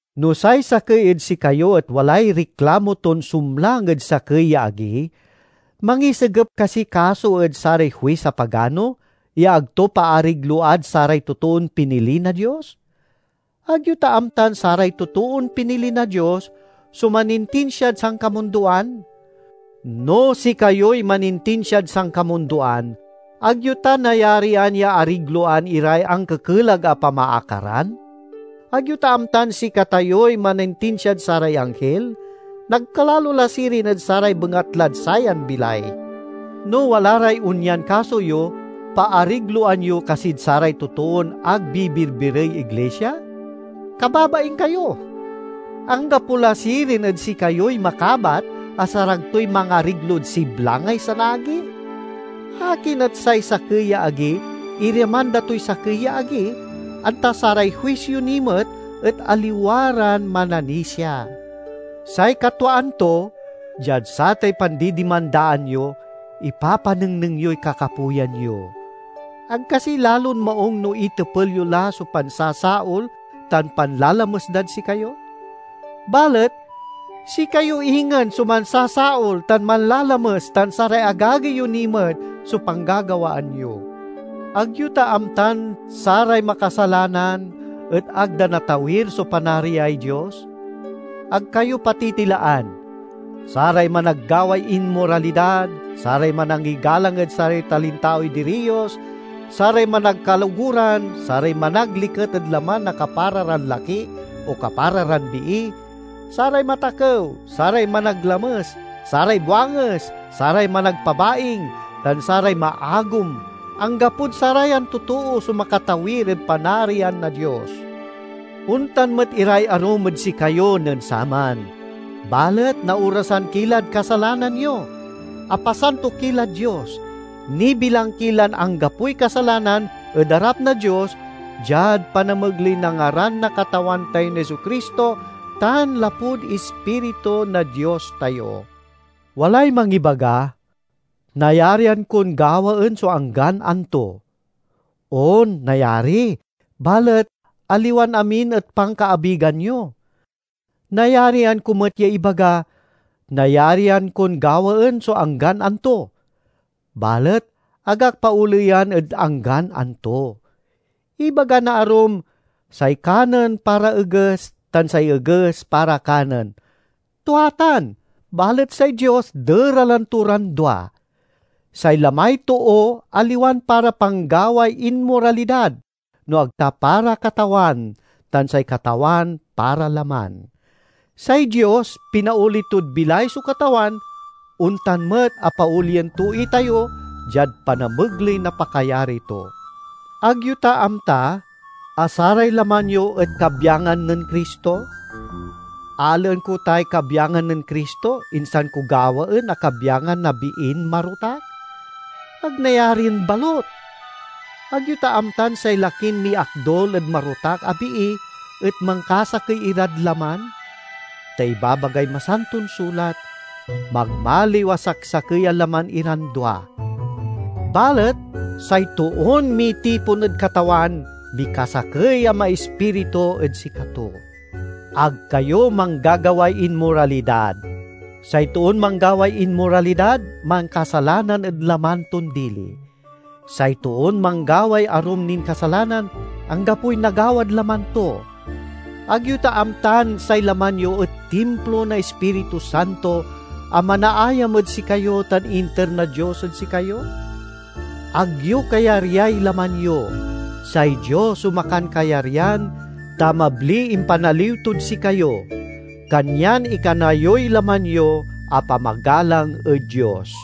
No say sakey ed sikayo et walay riklamo ton sumlang ed sakey ya agi, mangisigep kasiy kaso ed saray huis a pagano, ya ag to paarigload saray totoon pinili na Dios? Ag yo ta amtan saray totoon pinili na Dios so manintinsiad sankamundoan? No sikayoy manintisiad sankamundoan, ag yo ta nayarian ya arigloan iray ankekelag a pamaakaran? Ag yo ta amtan sikatayoy manintinsiad saray anghil? Nagkalalo la sirin ed saray bengatlad sayan bilay! No wala ray onyan kaso yo, paarigloan yo kasid saray totoon ag bibirbirey iglisia? Kababaing kayo! Anggapo la sirin ed sikayoy makabat a sarag toy mangariglod siblangay sanaagi? Akin et say sakey ya agi irimanda toy sakey ya agi, anta saray huis yo ni met et aliwa ran mananisia? Say katwaan to, diad satay pandidimandaan yo, ipapanengneng yoy kakapoyan yo. Ag kasi lalon maung no itepel yo la so pansasaol tan panlalames dad sikayo? Balet sikayo ingen so mansasaol tan manlalames—tan saray agagi yo ni met so panggagawaan yo! Ag yo ta amtan saray makasalanan et ag da natawir so Panariay Dios? Ag kayo patitilaan! Saray managgaway inmoralidad, saray manangigalang ed saray talintaoy diriyos, saray managkaloguran, saray managliket ed laman na kapara ran laki o kapara ran bii, saray matakew, saray managlames, saray buanges, saray managpabaing, tan saray maagom–anggapod sarayan totoo so makatawir ed Panarian na Dios. Ontan met iray arum ed sikayo nen saman. Balet naorasan ki lad kasalanan yo; apasanto ki lad Dios; nibilang ki lan anggapoy kasalanan ed arap na Dios diad panamegley na ngaran na Katawan tayon Jesu-Cristo tan lapud Ispiritu na Dios tayo. Walay mangibaga, "Nayarian kon gawaen so anggan anto." On, nayari, balet aliwan amin et pankaabigan yo. Nayarian ko met ya ibaga, "Nayarian kon gawaen so anggan anto"; balet ag ak paoleyan ed anggan anto. Ibaga na arum, "Say kanen para eges, tan say eges para kanen." Tua tan, balet say Dios deralen to ran dua. Say lamay too aliwan para panggaway inmoralidad, no ag ta para Katawan, tan say Katawan para laman. Say Dios pinaoli tod bilay so Katawan, ontan met a paolien to itayo diad panamegley na pakayari to. Ag yo ta amta a saray laman yo et kabyangan nen Cristo? Alaen ko tay kabyangan nen Cristo, insan ko gawaen a kabyangan na biin marotak? Ag nayarin balut! Ag yo ta amtan say lakin miakdul ed marotak a bii et mankasakey irad laman? Ta ibabagay Masanton Sulat, "Magmaliw a saksakey a laman iran dua." Balet say toon mitipon ed Katawan mikasakey a maispiritu ed sikato. Ag kayo manggagaway inmoralidad. Say toon manggaway inmoralidad mankasalanan ed laman ton dili. Say toon manggaway arum nin kasalanan, anggapoy nagawad laman to. Ag yo ta amtan say laman yo et timplo na Ispiritu Santo a manaayam ed sikayo tan inter na Dios ed sikayo? Ag yo kayaryay laman yo; say Dios so makankayaryan, ta mabliy impanaliw tod sikayo. Kanyan ikana yoy laman yo a pamagalang ed Dios.